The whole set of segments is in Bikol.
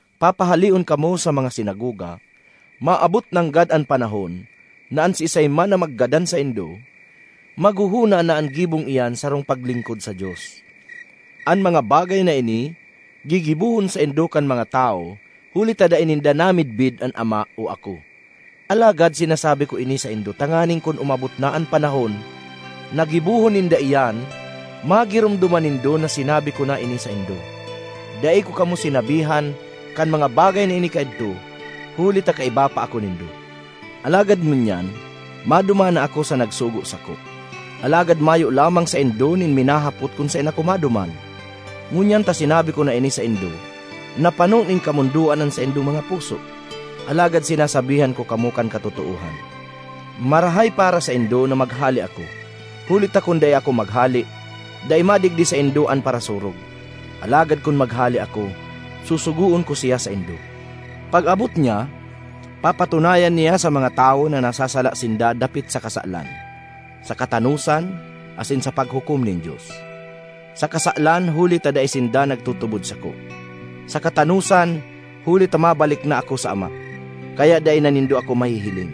Papahaleon kamo sa mga sinagoga; maabot nanggad an panahon na an siisay man na maggadan saindo maghohona na an gibong iyan sarong paglingkod sa Dios. An mga bagay na ini gigibohon saindo kan mga tawo huli ta dai ninda namidbid an Ama o ako. Alagad sinasabi ko ini saindo tanganing kun umabot na an panahon na gibohon ninda iyan, magiromdoman nindo na sinabi ko na ini saindo. “Dai ko kamo sinabihan kan mga bagay na ini kaidto, huli ta kaiba pa ako nindo. Alagad ngunyan maduman na ako sa nagsugo sako; alagad mayo lamang saindo nin minahapot kun saen ako maduman. Ngunyan ta sinabi ko na ini saindo, napano nin kamondoan an saindong mga puso. Alagad sinasabihan ko kamo kan katotoohan: marahay para saindo na maghale ako, huli ta kun dai ako maghale, dai madigdi saindo an Parasurog. Alagad kun maghale ako, susugoon ko siya saindo. Pag-abot niya, papatunayan niya sa mga tawo na nasasala sinda dapit sa kasalan, sa katanosan, asin sa paghukom nin Dios: sa kasalan huli ta dai sinda nagtutubod sako; sa katanosan, huli ta mabalik na ako sa Ama, kaya dai na nindo ako mahihiling;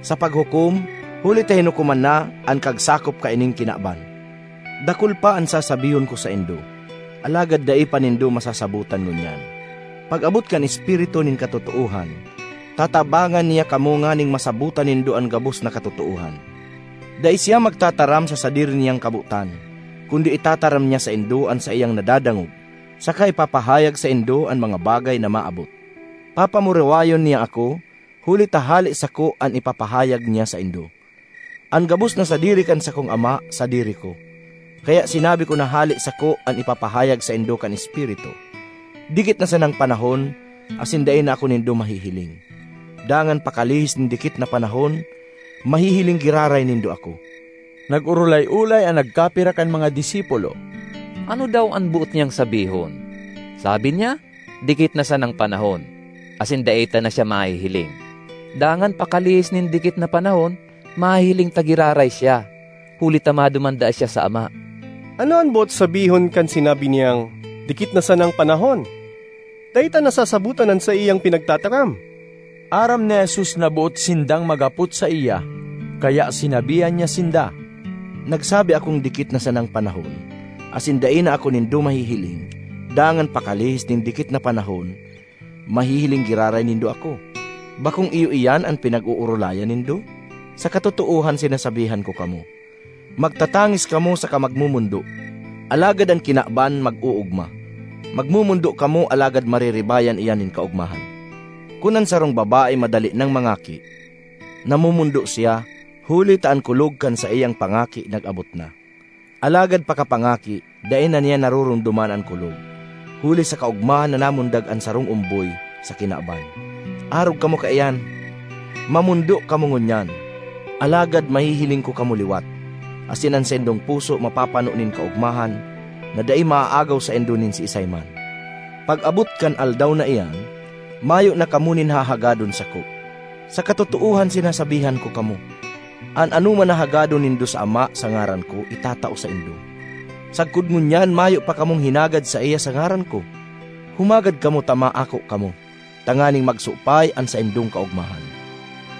sa paghukom, huli ta hinukoman na an kagsakop kaining kinaban. ”Dakul pa an sasabihon ko saindo, alagad dai pa nindo masasabotan ngunyan. Pag-abot kan Espiritu nin katotoohan, tatabangan niya kamo nganing masabotan nindo an gabos na katotoohan. Dai siya magtataram sa sadiri niyang kabotan, kundi itataram niya saindo an saiyang nadadangog, saka ipapahayag saindo an mga bagay na maabot. Papamurawayon niya ako, huli ta hale sako an ipapahayag niya saindo. An gabos na sadiri kan sakong Ama sadiri ko; kaya sinabi ko na hale sako an ipapahayag saindo kan Espiritu. ”Dikit na sanang panahon, asin dai na ako nindo mahihiling; dangan pakalihis nin dikit na panahon, mahihiling giraray nindo ako.” Nag-orolay-olay an nagkapira kan mga disipulo, “Ano daw an boot niyang sabihon? Sabi niya, dikit na sanang panahon, asin dai ta na siya mahihiling, dangan pakalihis nin dikit na panahon, mahihiling ta giraray siya, huli ta maduman daa siya sa Ama. Ano an boot sabihon kan sinabi niyang, ‘dikit na sanang panahon?’ Dai ta nasasabotan an saiyang pinagtataram!” Aram ni Jesus na boot sindang maghapot saiya, kaya sinabihan niya sinda, “Nagsabi akong ‘dikit na sanang panahon, asin dai na ako nindo mahihiling, dangan pakalihis nin dikit na panahon, mahihiling giraray nindo ako.’ Bakong iyo iyan an pinag-oorolayan nindo? Sa katotoohan sinasabihan ko kamo, magtatangis kamo saka magmomondo, alagad an kinaban mag-oogma; magmomondo kamo, alagad mariribayan iyan nin kaogmahan. Kun an sarong babae madali nang mangaki, namomondo siya, huli ta an kulog kan saiyang pangaki nag-abot na. Alagad pakapangaki, dai na niya naroromdoman an kulog, huli sa kaogmahan na namundag an sarong omboy sa kinaban. Arog kamo kaiyan: mamondo kamo ngunyan, alagad mahihiling ko kamo liwat, asin an saindong puso mapapano nin kaogmahan na dai maaagaw saindo nin siisay man. ”Pag-abot kan aldaw na iyan, mayo na kamo nin hahagadon sako. Sa katotoohan sinasabihan ko kamo, an anoman na hagadon nindo sa Ama sa ngaran ko, itatao saindo. Sagkod ngunyan mayo pa kamong hinagad saiya sa ngaran ko. Humagad kamo ta maako kamo, tanganing magsupay an saindong kaogmahan.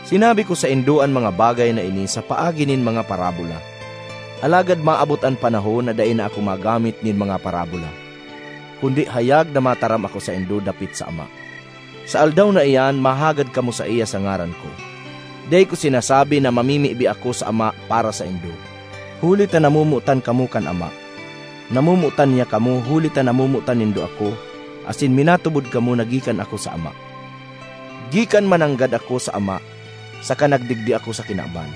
”Sinabi ko saindo an mga bagay na ini sa paagi nin mga parabola. Alagad maabot an panahon na dai na ako magamit nin mga parabola, kundi hayag na mataram ako saindo dapit sa Ama. Sa aldaw na iyan, mahagad kamo saiya sa ngaran ko; dai ko sinasabi na mamimibi ako sa Ama para saindo, huli ta namomotan kamo kan Ama. Namomotan niya kamo huli ta namomotan nindo ako asin minatubod kamo na gikan ako sa Ama. Gikan mananggad ako sa Ama saka nagdigdi ako sa kinaban;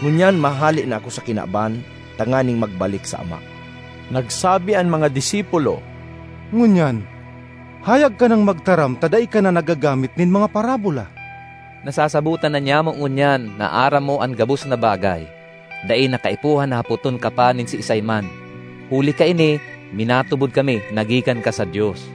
ngunyan mahale na ako sa kinaban tanganing magbalik sa Ama.” Nagsabi an mga disipulo, “Ngunyan hayag ka nang magtaram ta dai ka na naggagamit nin mga parabola. Nasasabotan na nyamo ngunyan na aram mo an gabos na bagay; dai na kaipuhan na hapoton ka pa nin siisay man. Huli kaini minatubod kami na gikan ka sa Dios.”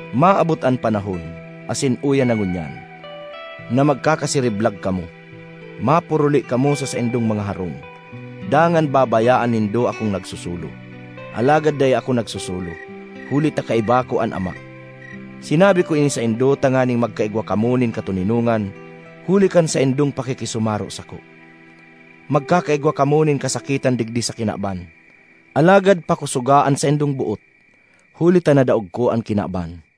Maabot an panahon—asin uya na ngunyan—na magkakasiriblag kamo, mapuruli kamo sa saindong mga harong, dangan babayaan nindo akong nagsosolo. Alagad dai ako nagsosolo, huli ta kaiba ko an Ama. Sinabi ko ini saindo tanganing magkaigwa kamo nin katoninongan huli kan saindong pakikisumaro sako. Magkakaigwa kamo nin kasakitan digdi sa kinaban; alagad pakosoga an saindong boot, huli ta nadaog ko an kinaban!”